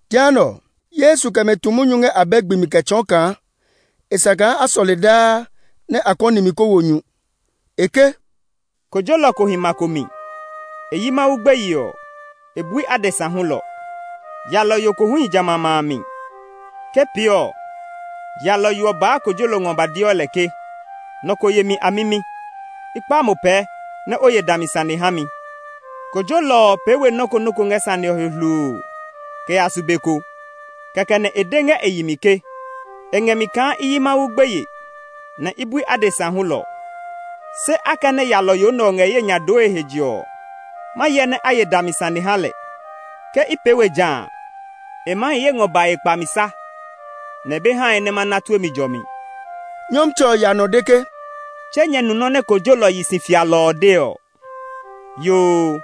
Jehanɛ ɔ, Yesu kɛ mɛ tu munyu ngɛ abɛ gbi mi kɛ tsɔɔ kaa e sa kaa a sɔle daa nɛ a kɔni mi kó wo nyu. E ke, “Kojolɔ ko hi ma ko mi; e yi Mawu gbeye ɔ, e bui adesa hulɔ. Yalɔyo ko hu hi jamɛ a ma a mi. Ke pee ɔ, yalɔyo ɔ baa kojolɔ ɔ ngɔ ba deɔ lɛ ke, ‘Nɔ ko ye mi amimi; i kpa mo pɛɛ nɛ o ye dami sane ha mi.’ Kojolɔ ɔ pee we nɔ́ ko nɔ́ ko ngɛ sane ɔ he hluu kɛ ya su be ko. Kɛkɛ nɛ e de ngɛ e yi mi ke, ‘E ngɛ mi kaa i yi Mawu gbeye, nɛ i bui adesa hulɔ, se akɛnɛ yalɔyo nɛ ɔ ngɛ ye nya dooe he je ɔ, ma hyɛ nɛ a ye dami sane ha lɛ. Ke i pee we ja a, e maa hi ye ngɔ bae kpamisa, nɛ e be hae nɛ ma na tue mi jɔmi.’” Nyɔmtsɛ ɔ ya nɔ de ke, “Tse nyɛ nu nɔ́ nɛ kojolɔ yi si fialɔ ɔ de ɔ? Yoo,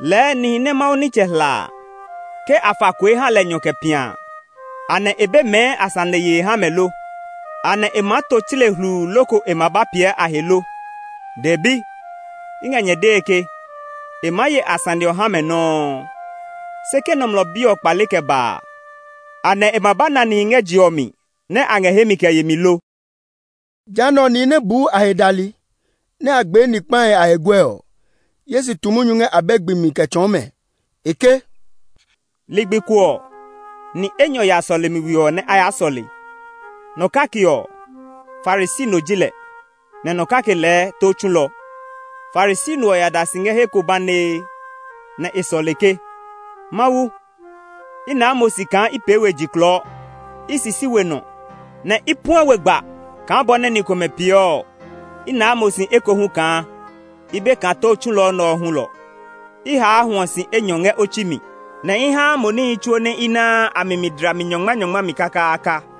lɛɛ nihi nɛ Mawu nitsɛ hla a, ke a fa kue ha lɛ nyɔ kɛ pia a, anɛ e be mɛɛ a sane yee ha mɛ lo? Anɛ e maa to tsle hluu loko e ma ba piɛ a he lo? Dɛbi, i ngɛ nyɛ dee ke, e maa ye a sane ɔ ha mɛ nɔuu. Se ke Nɔmlɔ Bi ɔ kpale kɛ ba a, anɛ e ma ba na nihi ngɛ je ɔ mi nɛ ngɛ hemi kɛ yemi lo?” Jehanɛ ɔ, nihi nɛ buu a he dali, nɛ a gbee ni kpahi a he guɛ ɔ, Yesu tu munyu ngɛ abɛ gbi kɛ tsɔɔ mɛ. E ke, “Ligbi ko ɔ, ni enyɔ ya sɔlemi we ɔ nɛ a ya sɔle; nɔ kake ɔ, Farisi no ji lɛ, nɛ nɔ kake lɛɛ tó tsulɔ. “Farisi no ɔ ya da si ngɛ he ko banee, nɛ e sɔle ke, ‘Mawu, i naa mo si kaa i pee we jiklɔɔ; i sisi we nɔ, nɛ i puɛ we gba kaa bɔ nɛ ni komɛ peeɔ ɔ. I naa mo si ekohu kaa i be kaa tó tsulɔ nɛ ɔ hulɔ. I haa hwɔ si enyɔ ngɛ otsi mi, nɛ i haa mo níhi tsuo nɛ i naa a mi dlami nyɔngmanyɔngma mi kakaaka.’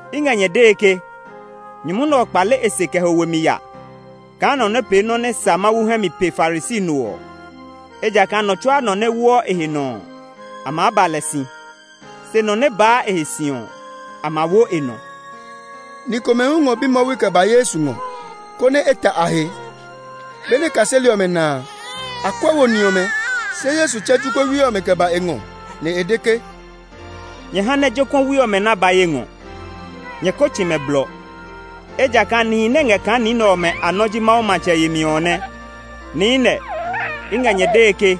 I ngɛ nyɛ dee ke, nyumu nɛ ɔ kpale e se kɛ ho we mi ya kaa nɔ nɛ pee nɔ́ nɛ sa Mawu hɛ mi pe Farisi no ɔ. Ejakaa nɔ tsuaa nɔ nɛ woɔ e he nɔ ɔ, a maa ba lɛ si; se nɔ nɛ baa e he si ɔ, a ma wo e nɔ.” Ni komɛ hu ngɔ bimwɔwi kɛ ba Yesu ngɔ, konɛ e ta a he. Benɛ kaseli ɔmɛ na a, a kuɛ wo ni ɔmɛ. Se Yesu tsɛ jokuɛwi ɔmɛ kɛ ba e ngɔ, nɛ e de ke, “Nyɛ ha nɛ jokuɛwi ɔmɛ nɛ a ba ye ngɔ; nyɛ ko tsi mɛ blɔ, ejakaa nihi nɛ ngɛ kaa ni nɛ ɔmɛ a nɔ́ ji Mawu matsɛ yemi ɔ nɛ. Niinɛ, i ngɛ nyɛ dee ke,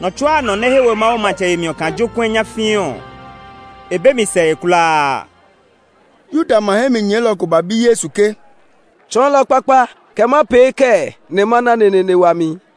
nɔ tsuaa nɔ nɛ he we Mawu matsɛ yemi ɔ kaa jokuɛ nyafii ɔ, e be mi sɛe kulaa.” Yuda ma hɛ mi nyɛɛlɔ ko ba bi Yesu ke, “Tsɔɔlɔ kpakpa, kɛ ma pee kɛɛ nɛ ma na neneene wami?”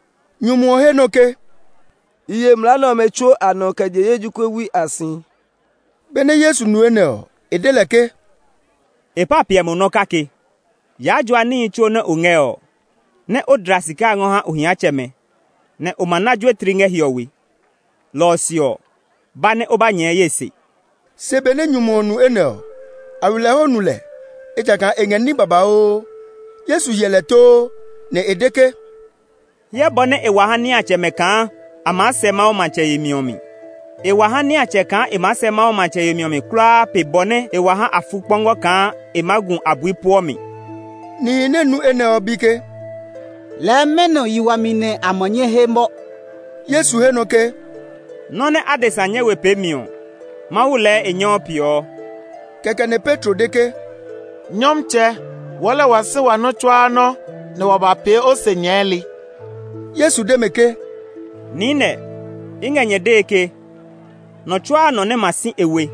Nyumu ɔ he nɔ ke, “I ye mlaa nɛ ɔmɛ tsuo a nɔ kɛ je ye jokuɛwi a si.” Benɛ Yesu nu enɛ ɔ, e de lɛ ke, “E pa piɛ mo nɔ́ kake. Yaa jua níhi tsuo nɛ o ngɛ ɔ, nɛ o dla sika a ngɔ ha ohiatsɛmɛ, nɛ o ma na juetli ngɛ hiɔwe. Lɔ ɔ se ɔ, ba nɛ o ba nyɛɛ ye se.” Se benɛ nyumu ɔ nu enɛ ɔ, nu lɛ, ejakaa e ngɛ ní babauu. Yesu hyɛ lɛ too, nɛ e de ke, “Hyɛ bɔ nɛ e wa ha niatsɛmɛ kaa a maa sɛ Mawu matsɛ yemi ɔ mi! E wa ha niatsɛ kaa e maa sɛ Mawu matsɛ yemi ɔ mi kulaa pe bɔ nɛ e wa ha afukpɔngɔ kaa e maa gu abui puɔ mi.” Nihi nɛ nu enɛ ɔ bi ke, “Lɛɛ mɛnɔ yi wami nɛ a ma nyɛ he mɔ?” Yesu he nɔ ke, “Nɔ́ nɛ adesa nyɛ we peemi ɔ, Mawu lɛɛ e nyɛɔ peeɔ.” Kɛkɛ nɛ Petro de ke, “Nyɔmtsɛ, wɔɔ lɛɛ wa si wa nɔ́ tsuaa nɔ́, nɛ wa ba pee o se nyɛɛli.” Yesu de mɛ ke, “Niinɛ, i ngɛ nyɛ dee ke, nɔ tsuaa nɔ nɛ ma si e we,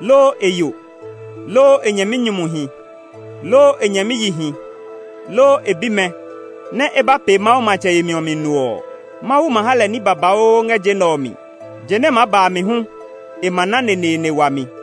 loo e yo, loo e nyɛminyumuhi, loo e nyɛmiyihi, loo e bimɛ, nɛ́ e ba pee Mawu matsɛ yemi ɔ mi no ɔ, Mawu ma ha lɛ ní babauu ngɛ je nɛ ɔ mi; je nɛ maa ba a mi hu, e ma na neneene wami.”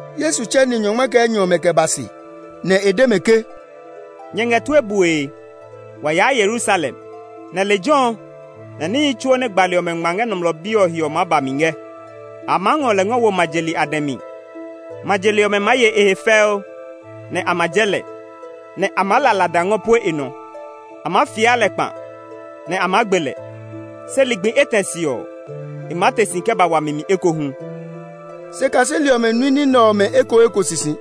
Yesu tsɛ ni nyɔngma kɛ enyɔ ɔmɛ kɛ ba se, nɛ e de mɛ ke, “Nyɛ ngɛ tue bue! Wa yaa Yerusalem, nɛ lejɛ ɔ lɛ níhi tsuo nɛ gbali ɔmɛ ngma ngɛ Nɔmlɔ Bi ɔ he ɔ maa ba mi ngɛ. A maa ngɔ lɛ ngɔ wo ma je li a dɛ mi; ma je li ɔmɛ maa ye e he fɛu, nɛ a ma jɛ lɛ, nɛ a maa la lada ngɔ pue e nɔ. A maa fia lɛ kpa, nɛ a maa gbe lɛ. Se ligbi etɛ se ɔ, e maa te si kɛ ba wami mi ekohu.” Se kaseli ɔmɛ nui ní nɛ ɔmɛ ekoeko sisi;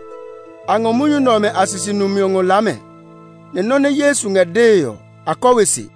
a ngɔ munyu ɔmɛ a sisi numi ngɔ laa mɛ, nɛ nɔ́ nɛ Yesu ngɛ dee ɔ, a kɔ we se.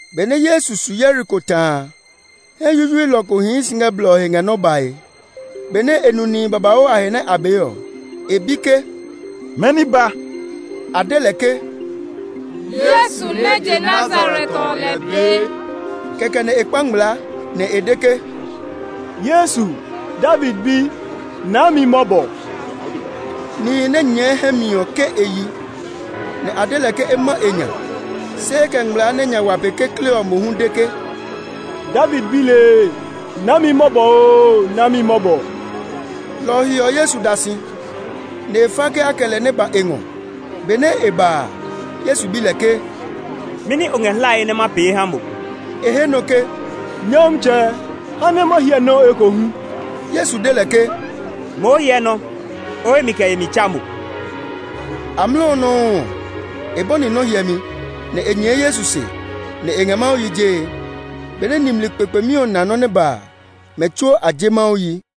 Benɛ Yesu su Yeriko ta a, hɛ yuyuilɔ ko hii si ngɛ blɔ ɔ he ngɛ nɔ́ bae. Benɛ e nu nihi babauu a he nɛ a bee ɔ, e bi ke, “Mɛni ba?” A de lɛ ke, “Yesu nɛ je Nazaret ɔ lɛ bee.” Kɛkɛ nɛ e kpa ngmlaa, nɛ e de ke, “Yesu! David bi! Naa mi mɔbɔ!” Nihi nɛ nyɛɛ hɛ mi ɔ ke e yi, nɛ a de lɛ ke e ma e nya. Se e kɛ ngmlaa nɛ nya wa pe kekle ɔ mohu de ke, “David bi lee! Naa mi mɔbɔ oo, naa mi mɔbɔ!” Lɔ ɔ he ɔ, Yesu da si, nɛ e fa ke a kɛ lɛ nɛ ba e ngɔ. Benɛ e ba a, Yesu bi lɛ ke, “Mɛni o ngɛ hlae nɛ ma pee ha mo?” E he nɔ ke, “Nyɔmtsɛ, ha nɛ ma hyɛ nɔ ekohu.” Yesu de lɛ ke, “Moo hyɛ nɔ́! O hemi kɛ yemi tsa mo.” Amlɔ ɔ nɔuu ɔ, e bɔni nɔ́ hyɛmi, nɛ e nyɛɛ Yesu se, nɛ e ngɛ Mawu yi jee. Benɛ nimli kpekpemi ɔ na nɔ́ nɛ ba a, mɛ tsuo a je Mawu yi.